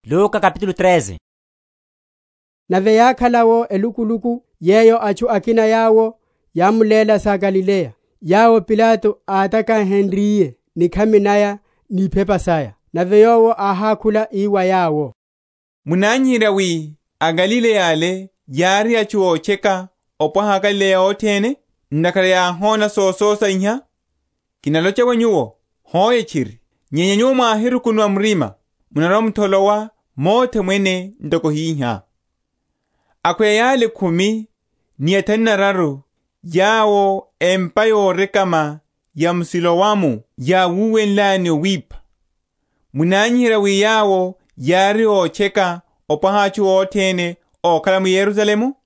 Oiphiwa wa aGalileya; empa ya m’Siloamu. Nave yákhala’wo elukuluku yeyo, atchu akina yawo yámulénle sa aGalileya, yawo Pilato átakahenryiye nikhami naya ni iphepa saya. Nave Yowo áhákhula ii wa yawo, Munanyiherya wi aGalileya ale yári atchu ótcheka opwaha aGalileya othene, ntakhara yáhona sososa iha? Kinalocha wa nyuwo, Hoe tchiri; nyenya nyuwo mwáhirukunuwa murima, munarwa‐mutholowa mothe mwene ntoko hihá. Akhweya yale khumi ni athanu nararu, yawo empa yorekama ya m’Siloamu yáwuwenlaya ni owipha; munanyiherya wi yawo yári ótcheka opwaha atchu othene ókhala m’Yerusalemu?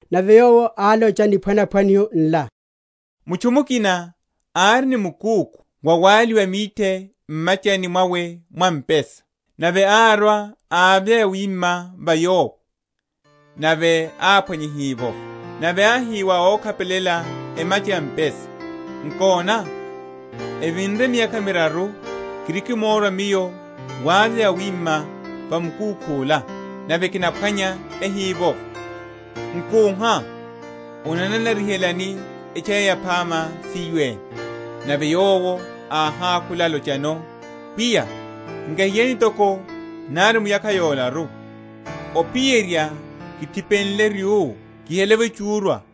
Nave Yowo álocha niphwanaphwaniho nla; Mutchu mukina ári ni mukúkhu wawaliwa mithe m’machani mwawe mwa mpesa. Nave árwa ávya yawima va yowo, nave áphwanya ehivovo. Nave áhi wa ókhapelela emacha ya mpesa, Nkona, evinre miyakha miraru kirikimórwa miyo wavya yawima va mukúkhu’la, nave kinaphwanya ehivovo: nkúha; onananarihelani etchaya yaphama siyo ene? Nave yowo áhákhula alochano, Pwiya, nkahiyani toko nari muyakha yolaru, ophiyerya kithipenle ryú, kihele’vo echúrwa;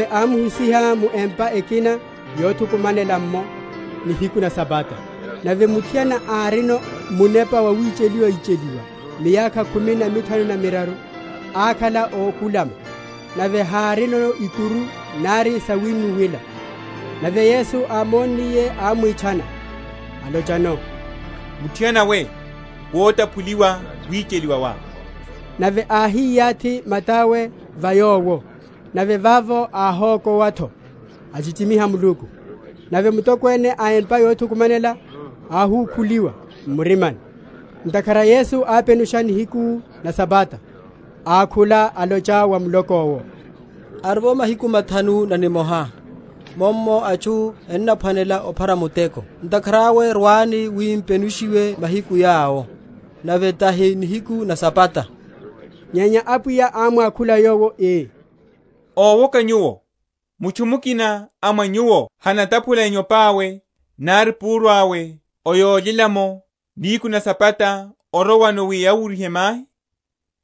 Nave ámuhusiha mu empa ekina yothukumanela’mo, nihiku na Sabata. Nave muthiana árino munepa wawicheliwa‐icheliwa miyakha khumi na mithanu na miraru; akhala ókulama, nave hárino ikuru nari sawinnuwela. Nave Yesu ámonniye, ámwitchana, alochano, Muthiana we, wotaphuliwa wicheliwa wá. Nave áhiyathi mata’we va yowo; nave vavo áhokowa’tho, achichimiha Muluku. Nave mutokwene a empa yothukumanela áhukhuliwa m’murima, ntakhara Yesu ápenusha nihiku na Sabata, ákhula, alocha wa muloko’wo, Arivo mahiku mathanu na nimoha, mummo atchu ennaphwanela ophara muteko, ntakhara awe rwani wi m’penushiwe mahiku yawo, nave tahi nihiku na Sabata. Nyenya Apwiya ámwakhula yowo, ii, Owoka nyuwo, mutchu mukina a mwa nyuwo hanataphula enyope awe, nari púru awe, o yólyela’mo, nihiku na Sabata, orowano wi awuryihe mahi?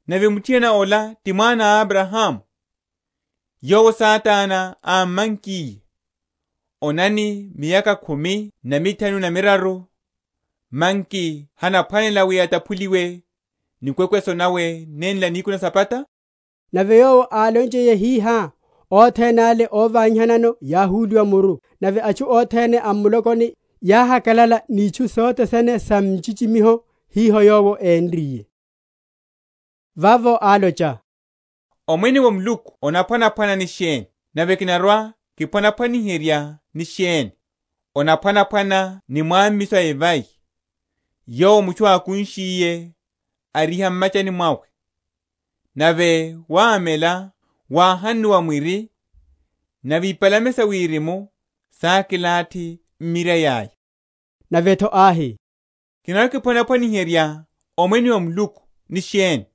Nave muthiana ola, ti mwana a Abrahamu, yowo Satana ámmankiye, onani, miyakha khumi na mithanu na miraru, manki honaphwanela, wi ataphuliwe nikwekweso nawe nenla nihiku na Sabata? Nave Yowo álonchiye hihá, othene ale óvanyihanano yáhulihiwa muru; nave atchu othene a m’mulokoni yáhakalala ni itchu sothe sene sa nchichimiho iho Yowo énriye. Niphwanaphwaniho na evai, n’na yoruruvaliha. Vavo álocha, Omwene wa Muluku onaphwanaphwana ni sheni? nave kinarwa‐kiphwaniherya ni sheni? Onaphwanaphwana ni mwámmiso a evai, yowo mutchu ákunshiye, ariha m’machani mwawe, nave wámela, wáhunnuwa mwiri; nave ipalame sa wirimu sákilathi m’mirai aya. Nave’tho áhi, Kinarwa‐kiphwaniherya Omwene wa Muluku ni sheni?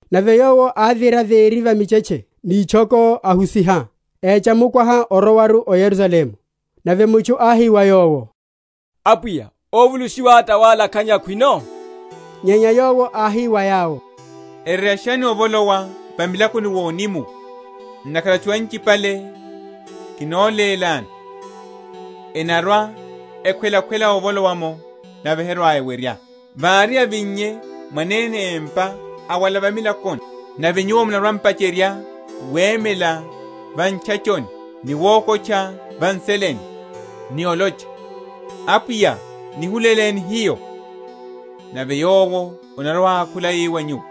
Nave Yowo ávira véri va michetche ni itchoko, ahusiha, écha mukwaha orowaru o Yerusalemu. Nave mutchu áhi wa Yowo, Apwiya, óvulushiwa tawala?-?khanyeya khwino? Nyenya Yowo áhi wa yawo, Ereryashani ovolowa va milakoni vonimuwa; ntakhara atchu anchipale, kinolélani, enarwa‐ekhwelakhwela ovolowa’mo, nave herwa‐ewerya. Vári avinnye mwanene empa awala va milakoni, nave nyuwo munarwa‐m’pacherya wemela va ntchachoni, ni wokotcha va nseleni, ni olocha, Apwiya nihuleleni hiyo; nave Yowo anarwa‐ákhula ii wa nyuwo,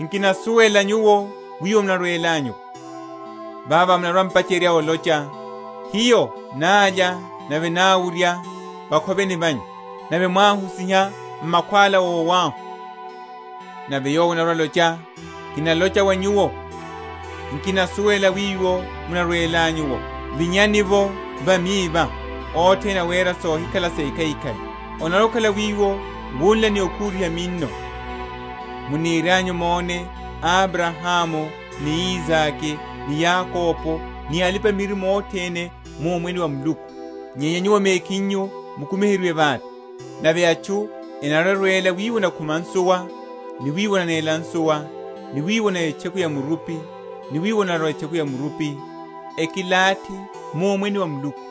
Nkinasuwela nyuwo wiwo munarwelanyu’wo; vavo munarwa‐m’pacherya olocha, Hiyo nálya nave náwurya vakhoveni vanyu, nave mwáhusiha m’makhwála ówahu: nave yowo anarwa‐alocha, Kinalocha wa nyuwo, Nkinasuwela wiwo munarwelanyu’wo; vinyani’vo va miva, othene awera sohikhala sekhaikhai. Onarwa‐okhala wiwo wunla ni okhuriha minno, munirianyu mone Abrahamu, ni Isake, ni Yakobo, ni alipa‐miririmo othene, mu Omwene wa Muluku, nyenya nyuwo mekhinyu mukumiheryiwe vate. Nave atchu enarwa‐erwela wiwo onakhuma nsuwa, ni wiwo onanéla nsuwa, ni wiwo onaya etcheku ya murupi, ni wiwo onarwela etcheku ya murupi, ekilathi mu Omwene wa Muluku.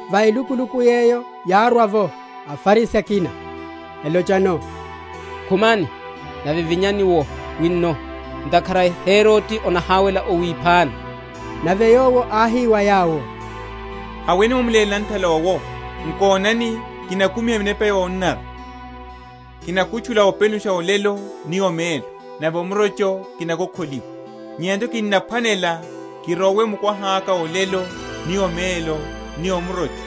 Va elukuluku yeyo yárwa’vo aFarisi akina, elochano, Khumani, nave vinyani’wo wino; ntakhara Herode anahawela owiphani. Nave Yowo áhi wa yawo, Haweni mwamuléle nanthala owo, Nkonani kinakumiha minepa yonanara, kinakutchula openusha olelo ni omelo, nave omurocho kinakokholiwa. Nyenya’tho kinnaphwanela kirowe mukwaha’ka olelo ni omelo ni omurocho,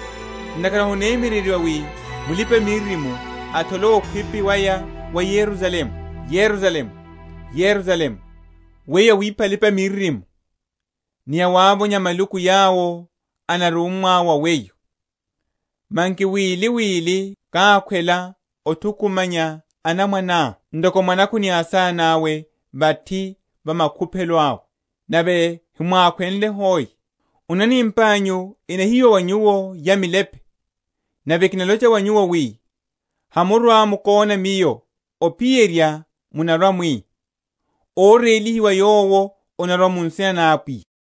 ntakhara honemyereryiwa wi mulipa‐miririmo atholowe okhwipi waya wa Yerusalemu. Yerusalemu, Yerusalemu, weyo awipha alipa‐miririmo, ni awavonya maluku yawo enarummwa wa weyo! manki wili wili kákhwela othukumanya anamwaneá, ntoko mwanakhu ni asana’we vathi va makuphelo awe, nave hemwákhwenle hoe! Onani empa’nyu enahiyiwa wa nyuwo, ya milepe; nave kinalocha wa nyuwo, wi, Hamurwa‐mukona Miyo, ophiyerya munarwa‐mwi, Órélihiwa Yowo anarwa mu nsina na Apwiya.